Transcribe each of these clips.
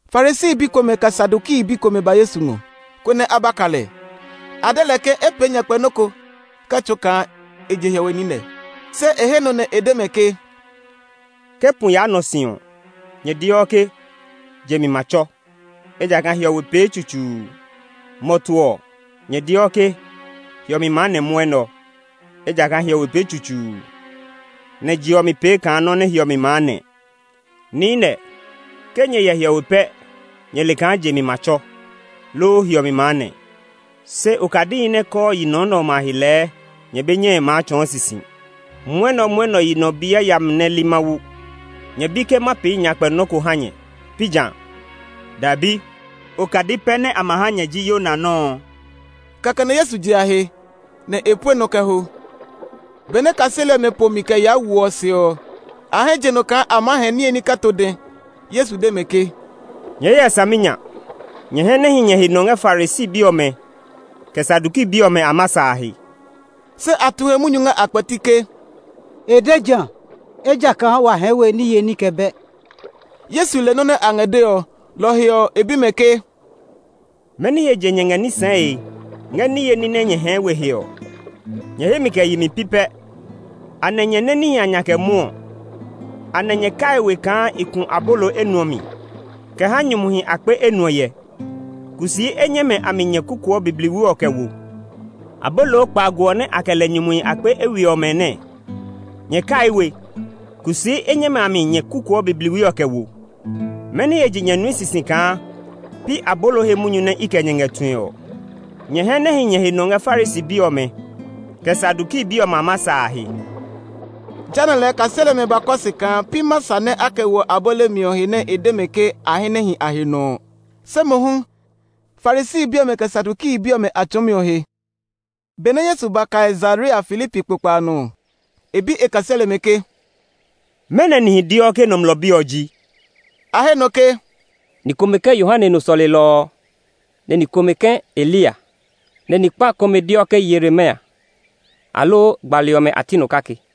Farisi bi komɛ, kɛ Saduki bi komɛ ba Yesu ngɔ, konɛ a ba ka lɛ. A de lɛ ke e pee nyakpɛ nɔ́ ko kɛ tsɔɔ kaa e je hiɔwe niinɛ. Se e he nɔ nɛ e de mɛ ke, [“Ke pu yaa nɔ si ɔ, nyɛ deɔ ke, ‘Je mi ma tsɔ, ejakaa hiɔwe pee tsutsuu.’ Mɔtu ɔ, nyɛ deɔ ke, ‘Hiɔmi maa nɛ mwɔnɛ ɔ, ejakaa hiɔwe pee tsutsuu, nɛ je ɔ mi pee kaa nɔ́ nɛ hiɔmi maa nɛ.’ Niinɛ, ke nyɛ hyɛ hiɔwe pɛ nyɛ le kaa je mi ma tsɔ, loo hiɔmi maa nɛ. Se okadihi nɛ kɔɔ yi nɔ nɛ ɔmɛ a he lɛɛ nyɛ be nyɛe maa tsɔɔ sisi!] Mwɔnɛmwɔnɛ yi nɔ bi yayami nɛ li Mawu! Nyɛ bi ke ma pee nyakpɛ nɔ́ ko ha nyɛ, pi jã? Dɛbi! Okadi pɛ nɛ a ma ha nyɛ ji Yona nɔ́ ɔ.” Kɛkɛ nɛ Yesu je a he, nɛ e pue nɔ kɛ ho. Benɛ kaseli ɔmɛ po mi kɛ yaa wo ɔ se ɔ, a hɛ je nɔ kaa a maa hɛɛ niye ní kɛ to dɛ. Yesu de mɛ ke, “Nyɛɛ hyɛ saminya! Nyɛ hɛ nɛ hi nyɛ he nɔ ngɛ Farisi bi ɔmɛ, kɛ Saduki bi ɔmɛ a masa a he!” Se a tu he munyu ngɛ a kpɛti ke, “E de jã, ejakaa wa hɛɛ we niye ní kɛ bɛ!” Yesu le nɔ́ nɛ a ngɛ dee ɔ, lɔ ɔ he ɔ, e bi mɛ ke, “Mɛni he je nyɛ ngɛ ní sɛɛe ngɛ niye ní nɛ nyɛ hɛɛ we he ɔ? Nyɛ hemi kɛ yemi pi pɛ! Anɛ nyɛ nɛ níhi a nya kɛ mwɔɔ? Anɛ nyɛ kai we kaa i ku abolo enuɔ mi kɛ ha nyumuhi akpe enuɔ hyɛ? Kusii enyɛmɛ a mi nyɛ kukuɔ bibliwi ɔ kɛ wo? Abolo kpaago ɔ nɛ a kɛ lɛ nyumuhi akpe eywiɛ ɔmɛ nɛɛ, nyɛ kaii we? Kusii enyɛmɛ a mi nyɛ kukuɔ bibliwi ɔ kɛ wo? Mɛni he je nyɛ nui sisi kaa pi abolo he munyu nɛ i kɛ nyɛ ngɛ tue ɔ? Nyɛ hɛ nɛ hi nyɛ he nɔ ngɛ Farisi bi ɔmɛ, kɛ Saduki bi ɔmɛ a masa a he!” Jehanɛ lɛɛ kaseli ɔmɛ ba kɔ se kaa pi masa nɛ a kɛ woɔ abolo mi ɔ he nɛ e de mɛ ke a hɛ nɛ hi a he nɔ ɔ, se mohu, Farisi bi ɔmɛ, kɛ Saduki bi ɔmɛ a tsɔɔmi ɔ he. Benɛ Yesu ba Kaisarea Filipi kpokpa a nɔ ɔ, e bi e kaseli ɔmɛ ke, “Mɛnɔ nihi deɔ ke Nɔmlɔ Bi ɔ ji?” A he nɔ ke, “Ni komɛ ke Yohane nɔ sɔlelɔ ɔ; ni komɛ ke Eliya, nɛ ni kpa komɛ deɔ ke Yeremia, aloo gbali ɔmɛ a ti nɔ kake.”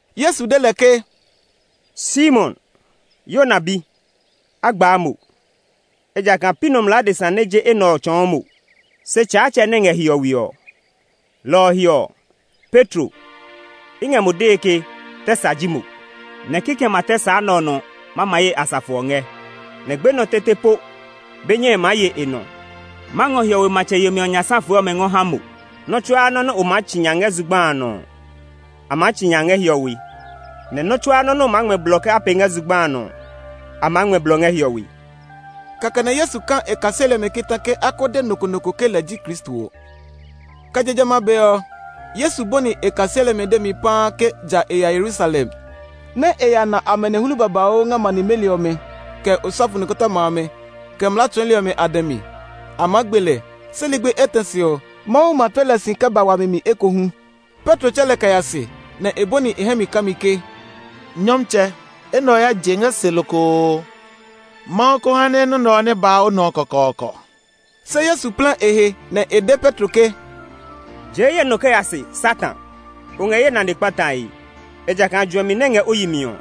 Yesu de lɛ ke, “Simon, Yona bi, a gbaa mo! Ejakaa pi nɔmlɔ adesa nɛ je enɛ ɔ tsɔɔ mo; se Tsaatsɛ nɛ ngɛ hiɔwe ɔ. Lɔ ɔ he ɔ, Petro, i ngɛ mo dee ke tɛ sa ji mo, nɛ kikɛmɛ a tɛ sa nɛ ɔ nɔ ma ma ye asafo ɔ ngɛ. Nɛ gbenɔ tete po be nyɛe maa ye e nɔ. Ma ngɔ hiɔwe matsɛ yemi ɔ nya safe ɔmɛ ngɔ ha mo. Nɔ́ tsuaa nɔ́ nɛ o maa tsi nya ngɛ zugba a nɔ ɔ, a maa tsi nya ngɛ hiɔwe; nɛ nɔ́ tsuaa nɔ́ nɛ o maa ngmɛ blɔ ke a pee ngɛ zugba a nɔ ɔ, a maa ngmɛ blɔ ngɛ hiɔwe.” Kɛkɛ nɛ Yesu ka e kaseli ɔmɛ kita ke a ko de nɔ ko nɔ ko ke lɛ ji Kristo ɔ. Kɛ je jamɛ a be ɔ, Yesu bɔni e kaseli ɔmɛ demi paa ke ja e ya Yerusalem, nɛ e ya na amanehlu babauu ngɛ ma nimeli ɔmɛ, kɛ osɔfo nikɔtɔma amɛ, kɛ mlaa tsɔɔli ɔmɛ a dɛ mi. A maa gbe lɛ, se ligbi etɛ se ɔ, Mawu ma tle lɛ si kɛ ba wami mi ekohu. Petro tsɛ lɛ kɛ ya se, nɛ e bɔni e hɛ mi kami ke, “Nyɔmtsɛ, enɛ ɔ ya je ngɛ se lokoo! Mawu ko ha nɛ nɔ́ nɛ ɔ nɛ ba o nɔ kɔkɔɔkɔ!” Se Yesu plɛ e he nɛ e de Petro ke, “Jee ye nɔ kɛ ya se, Satan! O ngɛ ye nane kpatae. Ejakaa juɛmi nɛ ngɛ o yi mi ɔ,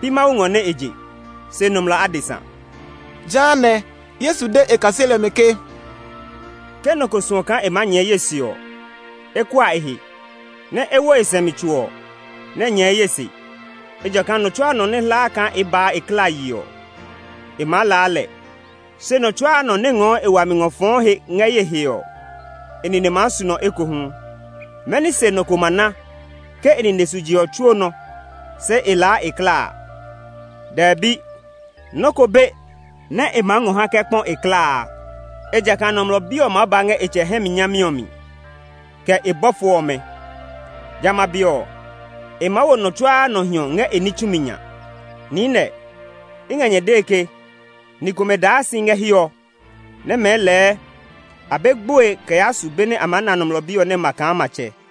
pi Mawu ngɔ nɛ e je, se nɔmlɔ adesa.” Jehanɛ, Yesu de e kaseli ɔmɛ ke, “Ke nɔ ko suɔ kaa e maa nyɛɛ ye se ɔ, e kua e he, nɛ e wo e sɛumi tso ɔ, nɛ e nyɛɛ ye se. Ejakaa nɔ tsuaa nɔ nɛ hlaa kaa e baa e klaa yi ɔ, e maa laa lɛ; se nɔ tsuaa nɔ nɛ ngɔɔ e wami ngɔ fɔɔ he ngɛ ye he ɔ, e nine maa su nɔ ekohu. Mɛni se nɔ ko ma na ke e nine su je ɔ tsuo nɔ, se e laa e klaa? Dɛbi! Nɔ́ ko be nɛ e ma ngɔ ha nɛ e kɛ kpɔ e klaa a. Ejakaa Nɔmlɔ Bi ɔ maa ba ngɛ e tsɛ hɛ mi nyami ɔ mi, kɛ e bɔfo ɔmɛ. Jamɛ a be ɔ, e maa wo nɔ tsuaa nɔ hiɔ ngɛ e ní tsumi nya. Niinɛ, i ngɛ nyɛ dee ke ni komɛ daa si ngɛ hiɛ ɔ nɛ mɛɛ lɛɛ a be gboe kɛ yaa su be nɛ a maa na Nɔmlɔ Bi ɔ nɛ ma kaa matsɛ.”